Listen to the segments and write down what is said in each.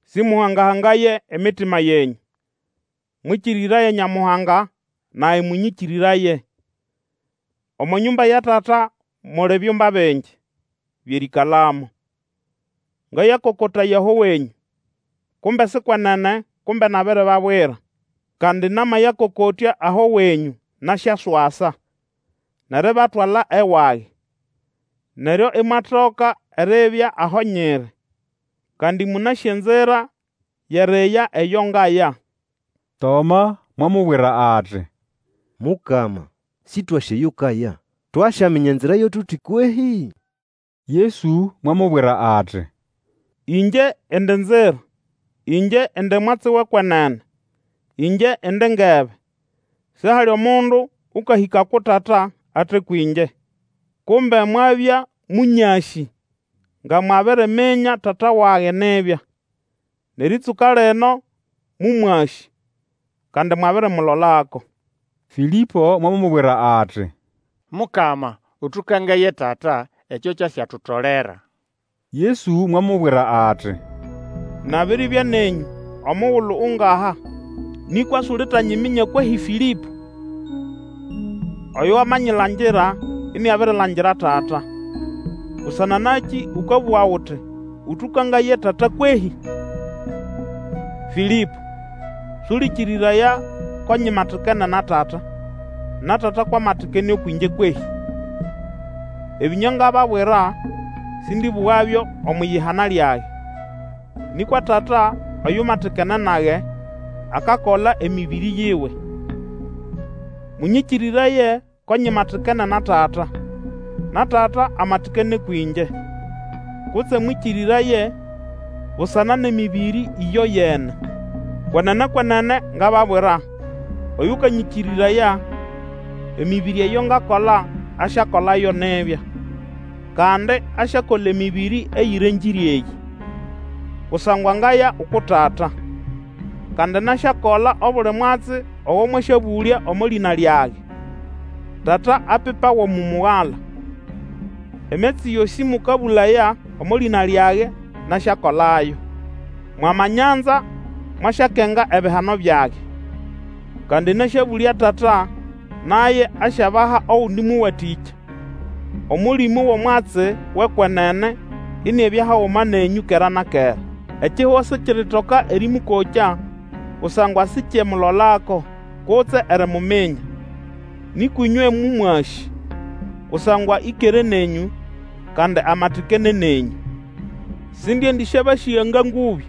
Sĩmũhanga-hangaye emitima yenyũ; mwĩkĩrĩraye Nyamuhanga, nage mũnyĩkĩrĩraye. Omo nyũmba ya Tata muli byumba bingi byʼerĩĩkalamo. Ngayakokotaya aho wenyũ, kumbe si kwenene, kumbe nabiribabwira. Kandi namayakokotya aho wenyũ, nasyaswasa, nʼeribatwala ewage; neryo imwatoka eribya aho nyiri. Kandi mũnasĩ enzira yʼeriya eyo ngaya. Toma mwamubwira ati, Mukama, Sĩtwasĩ eyo ukaya, twasyaminya enzira yo tuti kwehĩ? Yesu mwamubwira ati, Ĩngye indi nzira, ĩngye indi mwatsi wʼekwenene, ĩngye indi ngebe; sihali mundu ũkahĩka uku Tata ate kwĩngye. Kumbe mwabya mũnyasĩ, nga mwabiriminya Tata wage nibya. Nʼerĩtsũka lino mũmwasĩ, kandi mwabirimulolako. Fĩlĩpo mwamubwira ati, Mukama, ũtũkangaye Tata, ekyo kyasyatutolera. Yesu mwamubwira ati, Nabiribya nenyũ omugulu ungaha, nĩkwa sulitanyiminya kwehĩ Fĩlĩpo? Oyo wamanyilangira iniabirilangira Tata. Busana nakĩ ũkabũga uti, Ũtũkangaye Tata kwehĩ? Fĩlĩpo, sũlĩkĩrĩraya ko nyimatikene na Tata, na Tata kwʼamatikene ũkwʼĩngye kwehĩ? Ebĩnywa ngababwira sĩndĩbũgabyo omwʼiyihana lyage. Nĩkwa Tata oyumatikene nage akakola emĩbĩrĩ yiwe. Mũnyĩkĩrĩraye ko nyimatikene na Tata, na Tata amatikene ũkwʼĩngye. Kutse mwĩkĩrĩraye busana nʼemĩbĩrĩ ĩyoyene. Kwenene, kwenene ngababwira, oyũkanyĩkĩrĩraya, emĩbĩrĩ eyo ngakola, asyakolayo nibya; kandi asyakola emĩbĩrĩ eyĩrengĩre eyĩ, kusangwa ngaya uku Tata. Kandi nasyakola obuli mwatsi ogo mwasyabũlya omo lĩna lyage, Tata apipawe umu Mugala. Emyatsi yosĩ mũkabũlaya omo lĩna lyage, nasyakolayo. Mwamanyanza, mwasyakenga ebihano byage. Kandi nasyabũlya Tata, naye asyabaha ogundi Mũwatĩkya, Omũlĩmũ wʼomwatsi wʼekwenene iniabya haguma nenyũ kera na kera. Ekihugo sikiritoka erĩmũkokya, kusangwa sikyemulolako, kutse erimuminya. Nĩkwa ĩnywe mũmwasĩ, kusangwa ĩkere nenyũ, kandi amatikene nenyũ. Sindiendĩsyabasĩga nga ngũbĩ;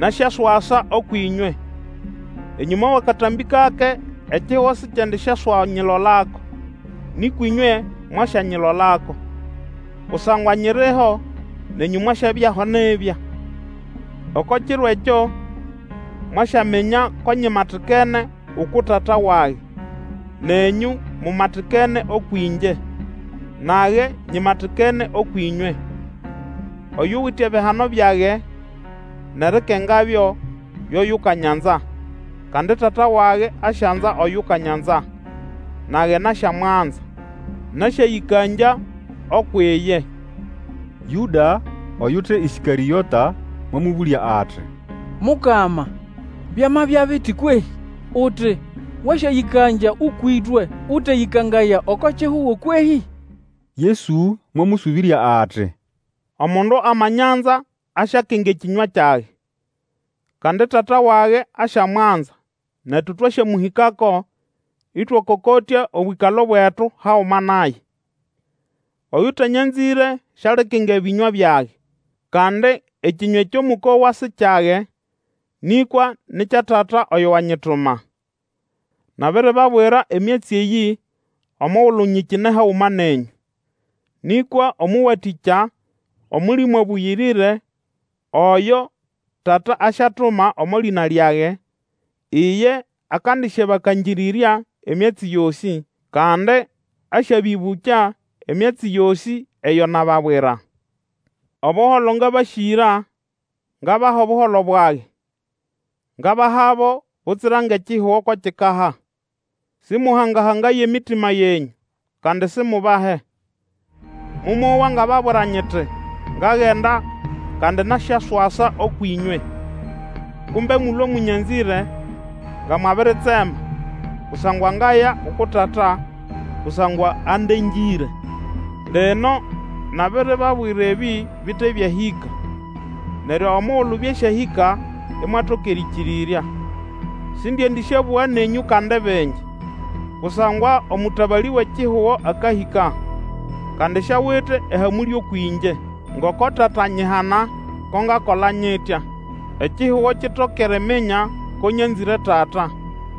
nasyaswasa ũkwʼĩnywe. Enyũma wʼakatambĩ kake ekihugo sikyendisyaswanyilolako, nĩkwa ĩnywe mwasyanyilolako; kusangwa nyiriho, nenyũ mwasyabyaho nibya. Oko kiro ekyo mwasyaminya ko nyimatikene uku Tata wage, nenyũ mumatikene ũkwʼĩngye nage nyimatikene ũkwʼĩnywe. Oyuwite ebihano byage, nʼerikengabyo, yo yukanyanza; kandi Tata wage asyanza oyukanyanza; nage nasyamwanza, nasyayĩkangya ukwʼiye. Yũda, oyute Ĩskarĩota, mwamũbũlya ati, Mukama, byamabya biti kwehĩ? uti, wasyayĩkangya ũkwʼĩtwe, ũteyĩkangaya oko kihugo kwehĩ? Yesu mwamũsũbĩrya ati, Omundu amanyanza asyakenga ekĩnywa kyage. Kandi Tata wage asyamwanza netu twasyamũhĩkako, ĩtwakokotya obwĩkalo bwetu haguma naye. Oyũtanyanzĩre sialikenga ebĩnywa byage. Kandi ekĩnywa ekyo mũkowa si kyage, nĩkwa ni kya Tata oyo wanyituma. Nabiribabwira emyatsi eyĩ omugulu nyikine haguma nenyũ. Nĩkwa Omũwatĩkya, Omũlĩmũ Abũyĩrĩre, oyo Tata asyatuma omo lĩna lyage, iye akandisyabakangĩrĩrya emyatsi yosĩ, kandi asyabĩbũkya emyatsi yosĩ eyo nababwira. Obuholo ngabasĩgĩra, ngabaha Obuholo bwage. Ngabahabo, butsira ngʼekihugo ko kikaha. Sĩmũhangahangaye emitima yenyũ, kandi simubahe. Momowa ngababwira nyiti, Ngagenda, kandi nasyaswasa ũkwʼĩnywe. Kumbe mulwe mũnyanzĩre, nga mwabiritsema, kusangwa ngaya uku Tata; kusangwa andengĩre. Lino nabiribabwira ebĩ bite byahĩka, neryo omugulu byasyahĩka, imwatoka erĩkĩrĩrya. Sindiendĩsyabũga nenyũ kandi bingi, kusangwa omũtabalĩ wʼekihugo akahĩka, kandi siawite ehamũlĩ ũkwʼĩngye. Ngoko Tata anyihana, ko ngakola nyitya, ekihugo kitoke eriminya ko nyanzĩre Tata.